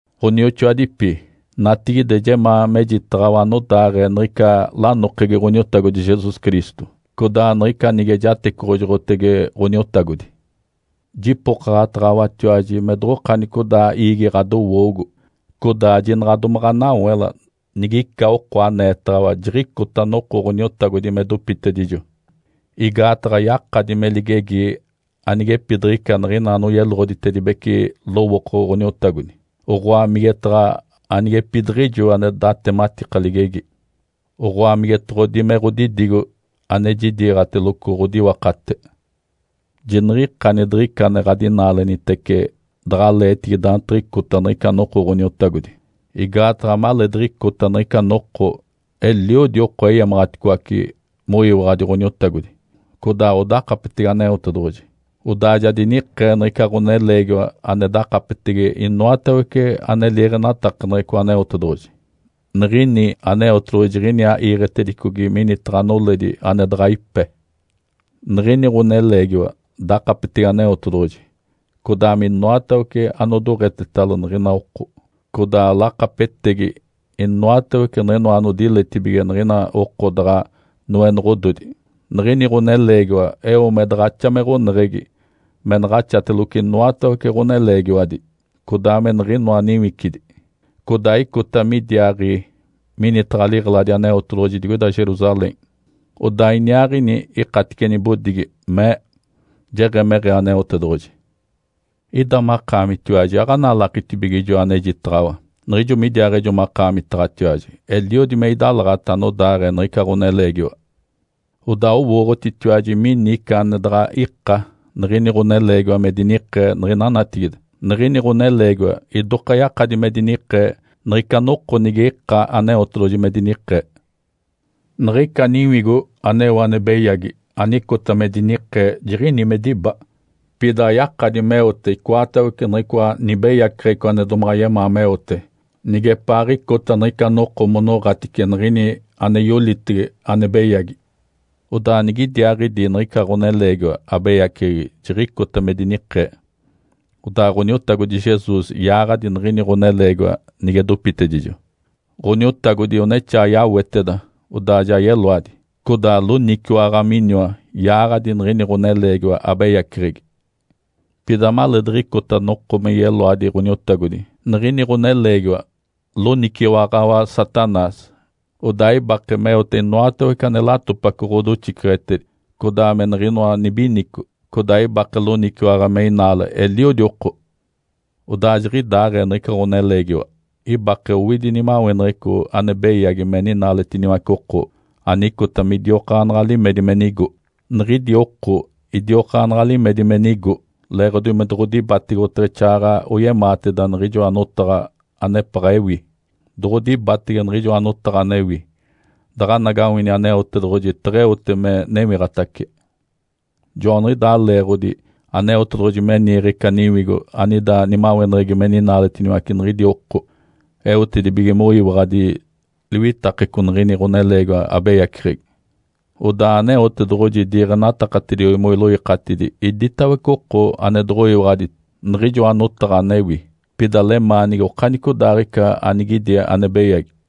Ǥonioxoadipi. Natigide jemaa mejitaɡ̶awa anodaaɡ̶ee niɡ̶ica lanokegi Ǥoniotagodi Jesus Cristo, codaa niɡ̶ica nige jatecoɡ̶ojoɡ̶otege Ǥoniotagodi. Jipokaɡ̶ataɡ̶awatiwaji me doɡ̶okanicodaa iigi ɡ̶adowoogo, codaa jinaɡ̶a domaɡ̶a anawela nigica oko aneetaɡ̶awa jiɡ̶icota noko Ǥoniotagodi me dopitedijo. Igaataɡ̶a yakadi me ligegi anigepidiɡ̶ica niɡ̶ina anoyeloɡ̶oditedibece lowooko Ǥoniotagodi, oɡ̶oa migetaɡ̶a anigepidiɡ̶ijo ane datematika ligegi, oɡ̶oa migetoɡ̶odi me ɡ̶odidigo ane jidiiɡ̶ateloco ɡ̶odiwakate. Jiniɡ̶ikani diɡ̶ica ane ɡ̶adinaalenitece daɡ̶aleetigi daantiɡ̶icota niɡ̶ica noko Ǥoniotagodi. Igaataɡ̶a maleediɡ̶icota niɡ̶ica noko eliodi oko eyamaɡ̶aticoace moyiwaɡ̶adi Ǥoniotagodi codaa odakapetege Aneotedoɡ̶oji. Odaa ja dinikee niɡ̶ica ɡ̶oneleegiwa ane dakapetege inoatawece ane liiɡ̶enatakaneɡ̶eco Aneotedoɡ̶oji, niɡ̶ini Aneotedoɡ̶oji jiɡ̶iniaa iiɡ̶etedicogi minitaɡ̶a noledi ane daɡ̶a ipe. Niɡ̶ini ɡ̶oneleegiwa dakapetege Aneotedoɡ̶oji, codaa minoatawece anodoɡ̶etetalo niɡ̶ina oko, codaa lakapetegi inoatawece niɡ̶inoa anodiletibige niɡ̶ina oko daɡ̶a noenoɡ̶ododi. Niɡ̶ini ɡ̶oneleegiwa eo me daɡ̶axa me ɡ̶oneɡ̶egi me naɡ̶axateloco inoatawece ɡ̶oneleegiwadi, codaa me niɡ̶inoa niwicidi. Codaa icota midiaaɡ̶i minitaɡ̶a liɡ̶eladi Aneotedoɡ̶oji digoida Jerusalém, odaa iniaaɡ̶ini ikatice nibodigi, mee, “Jeɡ̶emeɡ̶ee Aneotedoɡ̶oji.” Ida makaamitiwaji aɡ̶analakitibige ijo anejitaɡ̶awa? Niɡ̶ijo midiaaɡ̶ejo makaamitaɡ̶atiwaji, eliodi me idalaɡ̶ata anodaaɡ̶ee niɡ̶ica ɡ̶oneleegiwa. Odaa owooɡ̶otitiwaji mini ica ane daɡ̶a ika niɡ̶ini ɡ̶oneleegiwa me dinikee niɡ̶ina natigide. Niɡ̶ini ɡ̶oneleegiwa idoka yakadi me dinikee niɡ̶ica noko nige ika Aneotedoɡ̶oji me dinikee. Niɡ̶ica niwigo aneo ane beyagi anicota me dinikee jiɡ̶ini me diba, pida ayakadi meote icoatawece niɡ̶icoa nibeyaceɡ̶eco ane domaɡ̶a yemaa meote nigepaaɡ̶icota niɡ̶ica noko monoɡ̶atice niɡ̶ini ane yolitege ane beyagi. Odaa nigidiaaɡ̶idi niɡ̶ica ɡ̶oneleegiwa abeyaceɡ̶egi jiɡ̶icota me dinikee, odaa Ǥoniotagodi Jesus yaaɡ̶adi niɡ̶ini ɡ̶oneleegiwa nige dopitedijo. Ǥoniotagodi onexaa yaweteda, odaa ja yeloadi. Codaa loniciwaɡ̶a miniwa yaaɡ̶adi niɡ̶ini ɡ̶oneleegiwa abeyaceɡ̶egi. Pida maleediɡ̶icota noko me yeloadi Ǥoniotagodi, niɡ̶ini ɡ̶oneleegiwa loniciwaɡ̶awa Satanás, odaa ibake meote inoatawece ane latopaco ɡ̶odoxiceɡ̶etedi, codaa me niɡ̶inoa nibinico, codaa ibake loniciwaɡ̶a me inaale eliodi oko. Odaa jiɡ̶idaaɡ̶ee niɡ̶ica ɡ̶oneleegiwa ibake owidi nimaweneɡ̶eco ane beyagi me ninaaletiniwace oko anicota midiokaanaɡ̶a limedi me nigo. Niɡ̶idi oko idiokaanaɡ̶a limedi me nigo leeɡ̶odi me doɡ̶odibatege, oteɡ̶exaaɡ̶aɡ̶a oyemaateda niɡ̶ijoa notaɡ̶a anepaɡ̶a ewi. Doɡ̶odibatege niɡ̶ijoa notaɡ̶a anewi, daɡ̶anagawini Aneotedoɡ̶oji teɡ̶eote me newiɡ̶atace. Joaniɡ̶idaa leeɡ̶odi Aneotedoɡ̶oji me niiɡ̶e ica niwigo anida nimaweneɡ̶egi me ninaaletiniwace niɡ̶idi oko, eotedibige moyiwaɡ̶adi liwitakeco niɡ̶ini ɡ̶oneleegiwa abeyaceɡ̶egi. Odaa Aneotedoɡ̶oji diiɡ̶enatakatediogi moiloikatidi iditawece oko ane doɡ̶oyiwaɡ̶adi niɡ̶ijoa notaɡ̶a anewi, pida lemaanigi okanicodaaɡ̶ica anigidi ane beyagi.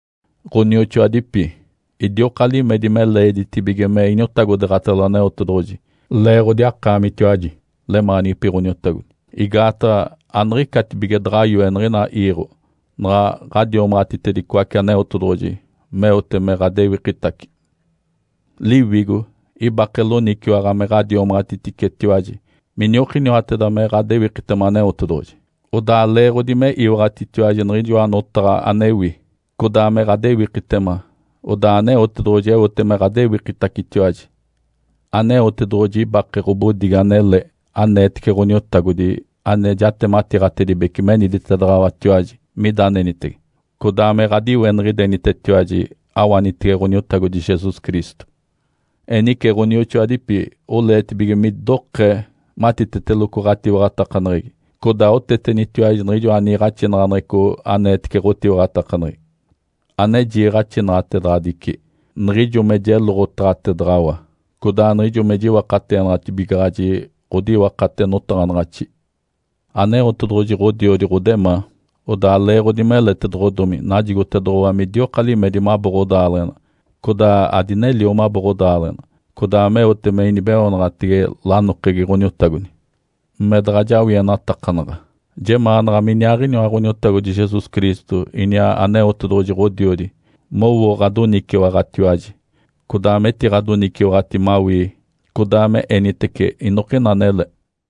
Ǥonioxoadipi. Idioka limedi me leeditibige me iniotagodeeɡ̶atalo Aneotedoɡ̶oji leeɡ̶odi akaamitiwaji, lemaanigipi Ǥoniotagodi. Igaataɡ̶a aniɡ̶icatibige daɡ̶a yoe niɡ̶ina iiɡ̶o, naɡ̶a ɡ̶adiomaɡ̶atitedicoace Aneotedoɡ̶oji meote me ɡ̶adewikitace. Liwigo ibake loniciwaɡ̶a me ɡ̶adiomaɡ̶atiticetiwaji miniokiniwateda me ɡ̶adewikitema Aneotedoɡ̶oji. Odaa leeɡ̶odi me iwaɡ̶atitiwaji niɡ̶inoa notaɡ̶a anewi, codaa me ɡ̶adewikitema, odaa Aneotedoɡ̶oji eote me ɡ̶adewikitacetiwaji. Aneotedoɡ̶oji ibake ɡ̶obodigi anele aneetece Ǥoniotagodi ane jatematiiɡ̶atedibece meniditedaɡ̶awatiwaji mida anenitege, codaa me ɡ̶adiweniɡ̶idenitetiwaji awanitege Ǥoniotagodi Jesus Cristo. Enice, ɡ̶onioxoadipi, oleetibige midokee matiteteloco ɡ̶atiwaɡ̶atakaneɡ̶egi, codaa otetenitiwaji niɡ̶ijoa niiɡ̶axinaɡ̶aneɡ̶eco aneetece ɡ̶otiwaɡ̶atakaneɡ̶egi, ane jiiɡ̶axinaɡ̶atedaɡ̶adici niɡ̶ijo me jeloɡ̶otaɡ̶atedaɡ̶awa, codaa niɡ̶ijo me jiwakateenaɡ̶atibigaɡ̶aji ɡ̶odiwakate notaɡ̶anaɡ̶axi. Aneotedoɡ̶oji Ǥodiodi ɡ̶odemaa, odaa leeɡ̶odi meletedoɡ̶odomi najigotedoɡ̶owa midioka limedi mabo ɡ̶odaaleɡ̶ena codaa adinelio mabo ɡ̶odaaleɡ̶ena, codaa meote me inibeoonaɡ̶atege lanokegi Ǥoniotagodi, me daɡ̶a jawienatakanaɡ̶a. Jemaanaɡ̶a miniaaɡ̶iniwa Ǥoniotagodi Jesus Cristo iniaa Aneotedoɡ̶oji Ǥodiodi mowo ɡ̶adoniciwaɡ̶atiwaji codaa metiɡ̶adoniciwaɡ̶ati mawii, codaa me enitece inokina anele.